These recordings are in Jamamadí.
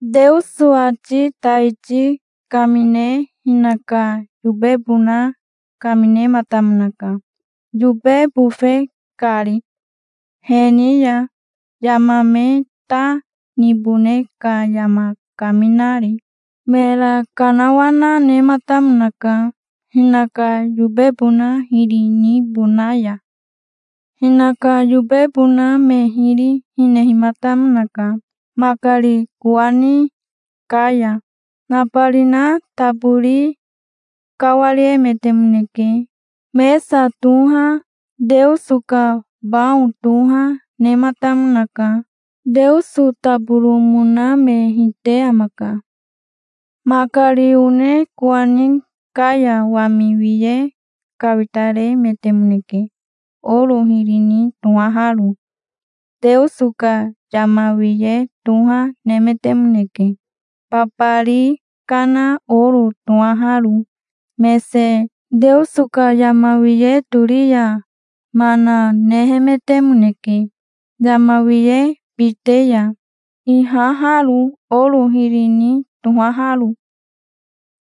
Teoso ati taiti kamine hinaka yobebona kaminematamonaka, yobe bofe kari, he ni ya yama me ta nibone ka yama kaminari. Mera kanawana nematamonaka, hinaka yobebona hiri nibona ya. Hinaka yobebona me hiri hinehimatamonaka. Makari kowani ka ya nabarina tabori kawariemetemoneke. Mesa toha, Teoso ka bao toha nematamonaka. Teoso taboromona me hite amaka. Makari one kowani ka ya wami wiye kawitaremetemoneke, oro hiri ni tohaharo. Teoso ka yama wiye toha nemetemoneke, babari kana oro tohaharo mese. Teoso ka yama wiye tori ya mana nehemetemoneke yama wiye bite ya ihaharo, oro hiri ni tohaharo.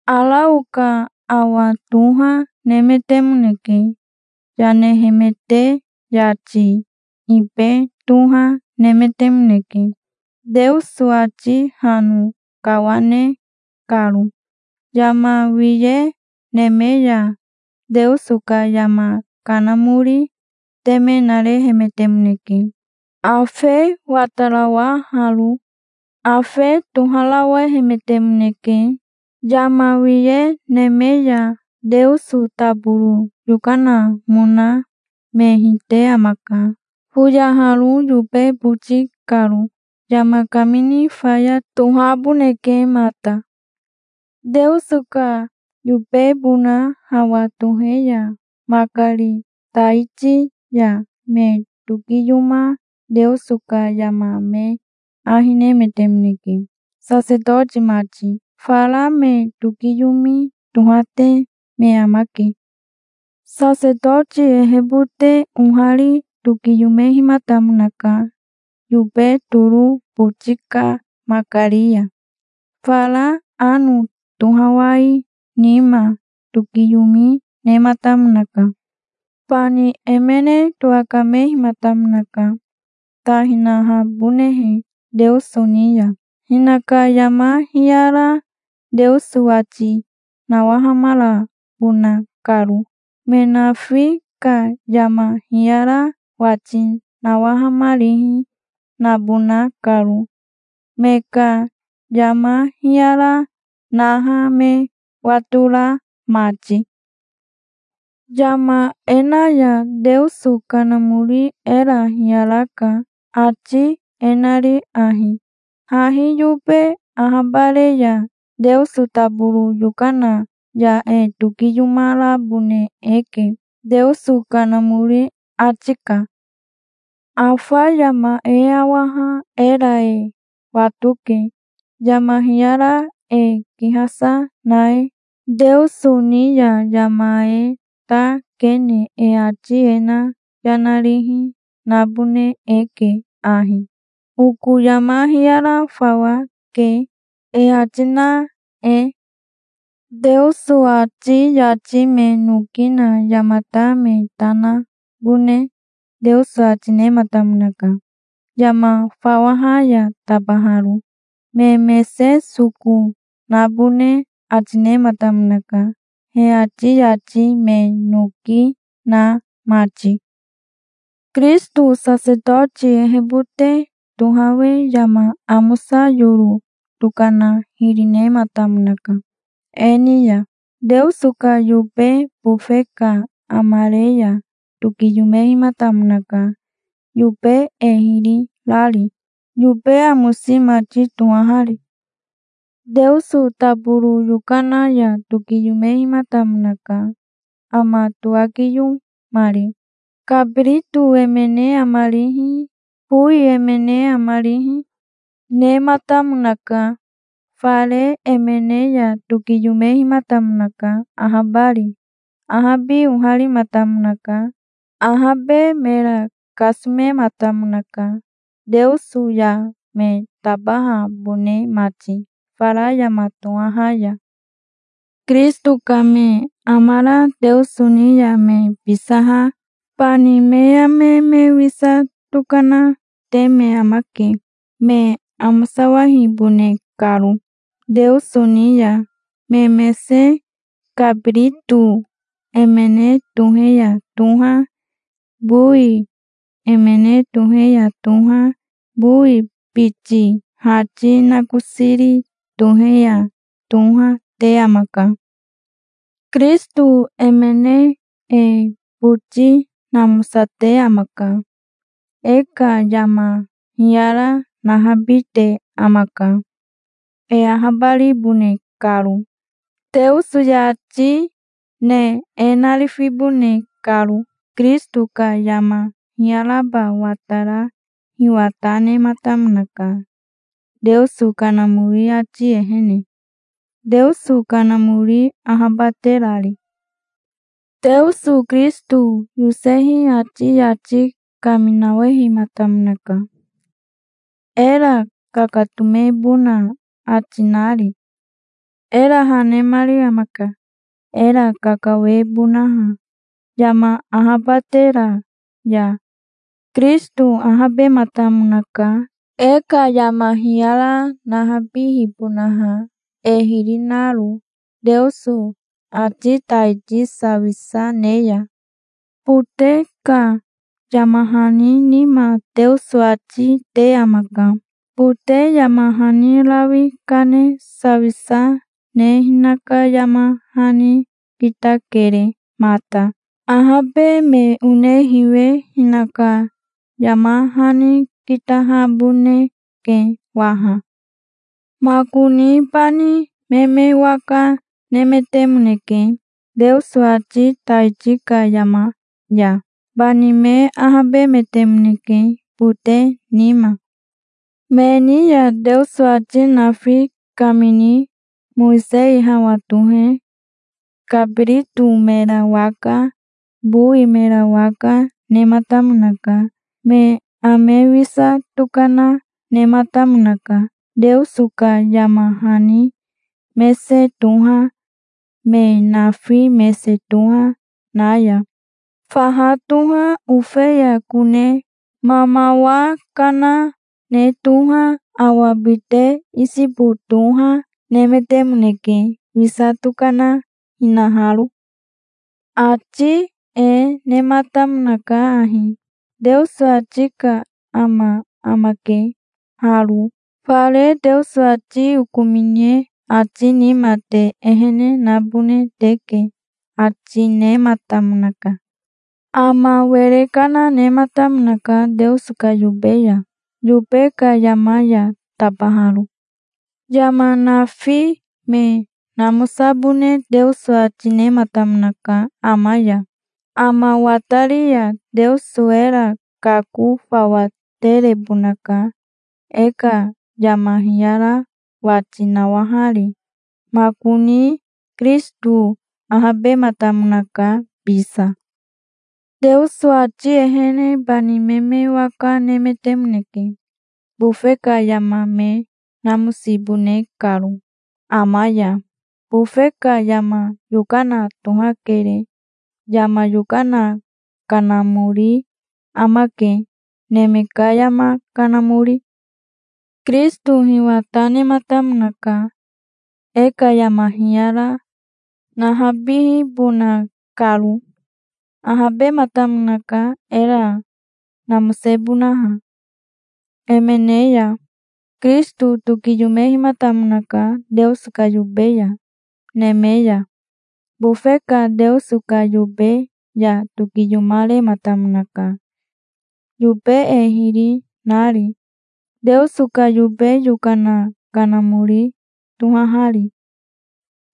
Arao ka awa toha nemetemoneke, yanehemete. Yati ibe toha nemetemoneke, Teoso ati hano kawane karo. Yama wiye neme ya Teoso ka yama kanamori teme narehemetemoneke, afe watarawaharo. Afe toharawehemetemoneke yama wiye neme ya. Teoso taboro yokanamona me hite amaka, foyaharo yobe boti karo. Yama kamini faya tohaboneke mata. Teoso ka yobebona hawa tohe ya makari taiti ya me tokiyoma Teoso ka yama me ahi nemetemoneke, sasetoti mati. Fara me tokiyomi tohate me amake. Sasetoti ehebote ohari tokiyomehimatamonaka yobe toro boti ka makari ya. Fara ano tohawai nima tokiyomi nematamonaka. Bani emene towakamehimatamonaka, ta hinahabonehe Teoso ni ya, hinaka yama hiyara Teoso wati nawahamarabona karo, me nafi ka yama hiyara wati nawahamarihi nabona karo, me ka yama hiyara naha me watora mati. Yama e na ya Teoso Kanamori era hiyaraka, ati e nari ahi: hahi yobe ahabare ya Teoso taboro yokana ya e tokiyomarabone eke, Teoso Kanamori ati ka. Afa yama e awaha era e watoke, yama hiyara e kihasa na e. Teoso ni ya yama e ta kene e ati e na yana rihi nabone eke ahi: "Oko yama hiyara fawa ke", e ati na e. Teoso ati yati me noki na yamata me ta nabone Teoso ati nematamonaka, yama fawaha ya tabaharo. Me mese soko nabone ati nematamonaka, he ati yati me noki na mati. Kirisito sasetoti ehebote tohawe yama amosa yoro tokana hiri nematamonaka e ni ya. Teoso ka yobe bofe ka amare ya tokiyomehimatamonaka, yobe e hiri rari, yobe amosi mati tohahari. Teoso taboro yokana ya tokiyomehimatamonaka, ama towakiyomari. Kabirito emene amarihi, bowi emene amarihi, nematamonaka. Fare emene ya tokiyomehimatamonaka, ahabari. Ahabi oharimatamonaka. Ahabe mera kasomematamonaka, Teoso ya me tabahabone mati fara yama tohaha ya. Kirisito ka me amara Teoso ni ya me bisaha bani me ame me wisa tokanate me amake, me amosawahibone karo Teoso ni ya, me mese. Kabirito emene tohe ya toha, bowi emene tohe ya toha, bowi biti hati nakosiri tohe ya toha, te amaka. Kirisito emene e boti namosate amaka. E ka yama hiyara nahabite amaka, e ahabaribone karo, Teoso yati ne e narifibone karo. Kirisito ka yama hiyaraba watara hiwa ta nematamonaka, Teoso Kanamori ati ehene, Teoso Kanamori ahabaterari. Teoso Kirisito yosehi ati yati kaminawahematamonaka, era kakatomebona ati nari. Era ha nemari amaka, era kakawebonaha yama ahabatera ya. Kirisito ahabematamonaka, e ka yama hiyara nahabihibonaha, e hiri naro, Teoso ati taiti sawisa ne ya. Bote ka yama hani nima Teoso ati te amaka. Bote yama hani rawi kane sawisa ne hinaka yama hani kitakere mata. Ahabe me one hiwe hinaka yama hani kitahaboneke waha. Makoni bani me me waka nemetemoneke, Teoso ati taiti ka yama ya. Bani me ahabemetemoneke bote nima. Me ni ya Teoso ati nafi kamini Mowisei hawa tohe kabirito mera waka, bowi mera waka, nematamonaka. Me ame wisa tokana nematamonaka, Teoso ka yama hani mese toha, me nafi mese toha na ya. Faha toha, ofeya kone mamawa kana ne toha, awa bite isobo toha, nemetemoneke, wisa tokana hinaharo. Ati e nematamonaka ahi: "Teoso ati ka ama amake haro. Fare Teoso ati okomine ati nima te ehene nabone teke", ati nematamonaka. Ama were kana nematamonaka Teoso ka yobe ya, yobe ka yama ya tabaharo. Yama nafi me namosabone Teoso ati nematamonaka ama ya. Ama watari ya Teoso era kako fawa terebonaka, e ka yama hiyara wati nawahari. Makoni Kirisito ahabematamonaka bisa. Teoso ati ehene bani me me waka nemetemoneke, bofe ka yama me namosibone karo ama ya. Bofe ka yama yokana tohakere. Yama yokana kanamori amake, neme ka yama kanamori. Kirisito hiwa ta nematamonaka, e ka yama hiyara nahabihibona karo. Ahabematamonaka, era namosebonaha, emene ya. Kirisito tokiyomehimatamonaka Teoso ka yobe ya neme ya. Bofe ka Teoso ka yobe ya tokiyomarematamonaka, yobe e hiri nari, Teoso ka yobe yokana kanamori tohahari.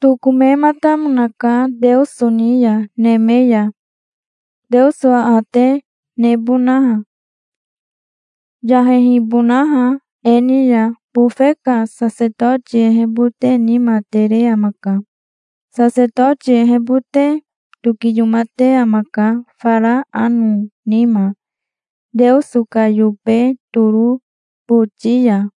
Tokomematamonaka Teoso ni ya neme ya, Teoso aate nebonaha, yahehibonaha e ni ya. Bofe ka sasetoti ehebote nima tere amaka. Sasetoti ehebote tokiyomate amaka fara ano nima, Teoso ka yobe toro boti ya,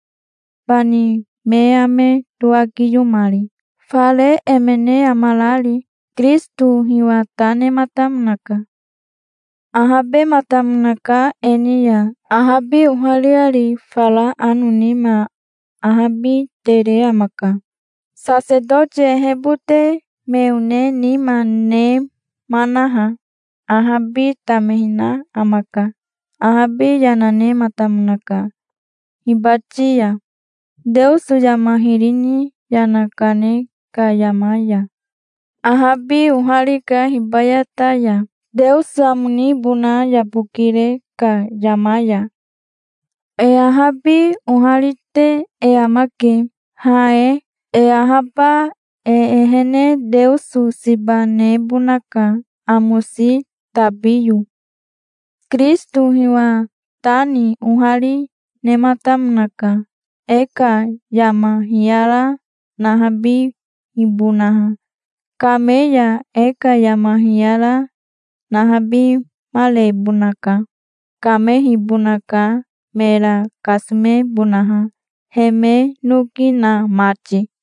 bani me ame towakiyomari, fare emene amarari. Kirisito hiwa ta nematamonaka. Ahabematamonaka e ni ya ahabi ohariari. Fara ano nima ahabi tere amaka. Sasetoti ehebote me one nima nemanaha, ahabi tamehina amaka. Ahabi yana nenamatamonaka, hibati ya, Teoso yama hiri ni yana kane ka yama ya. Ahabi oharika, hibayata ya, Teoso amo nibona yabokire ka yama ya. E ahabi oharite e amake, ha e. E ahaba e ehene Teoso siba nebonaka, amosi tabiyo. Kirisito hiwa ta ni ohari nematamonaka, e ka yama hiyara nahabihibonaha. Kame ya e ka yama hiyara nahabimarebonaka. Kamehibonaka, mera kasomebonaha, he me noki na mati.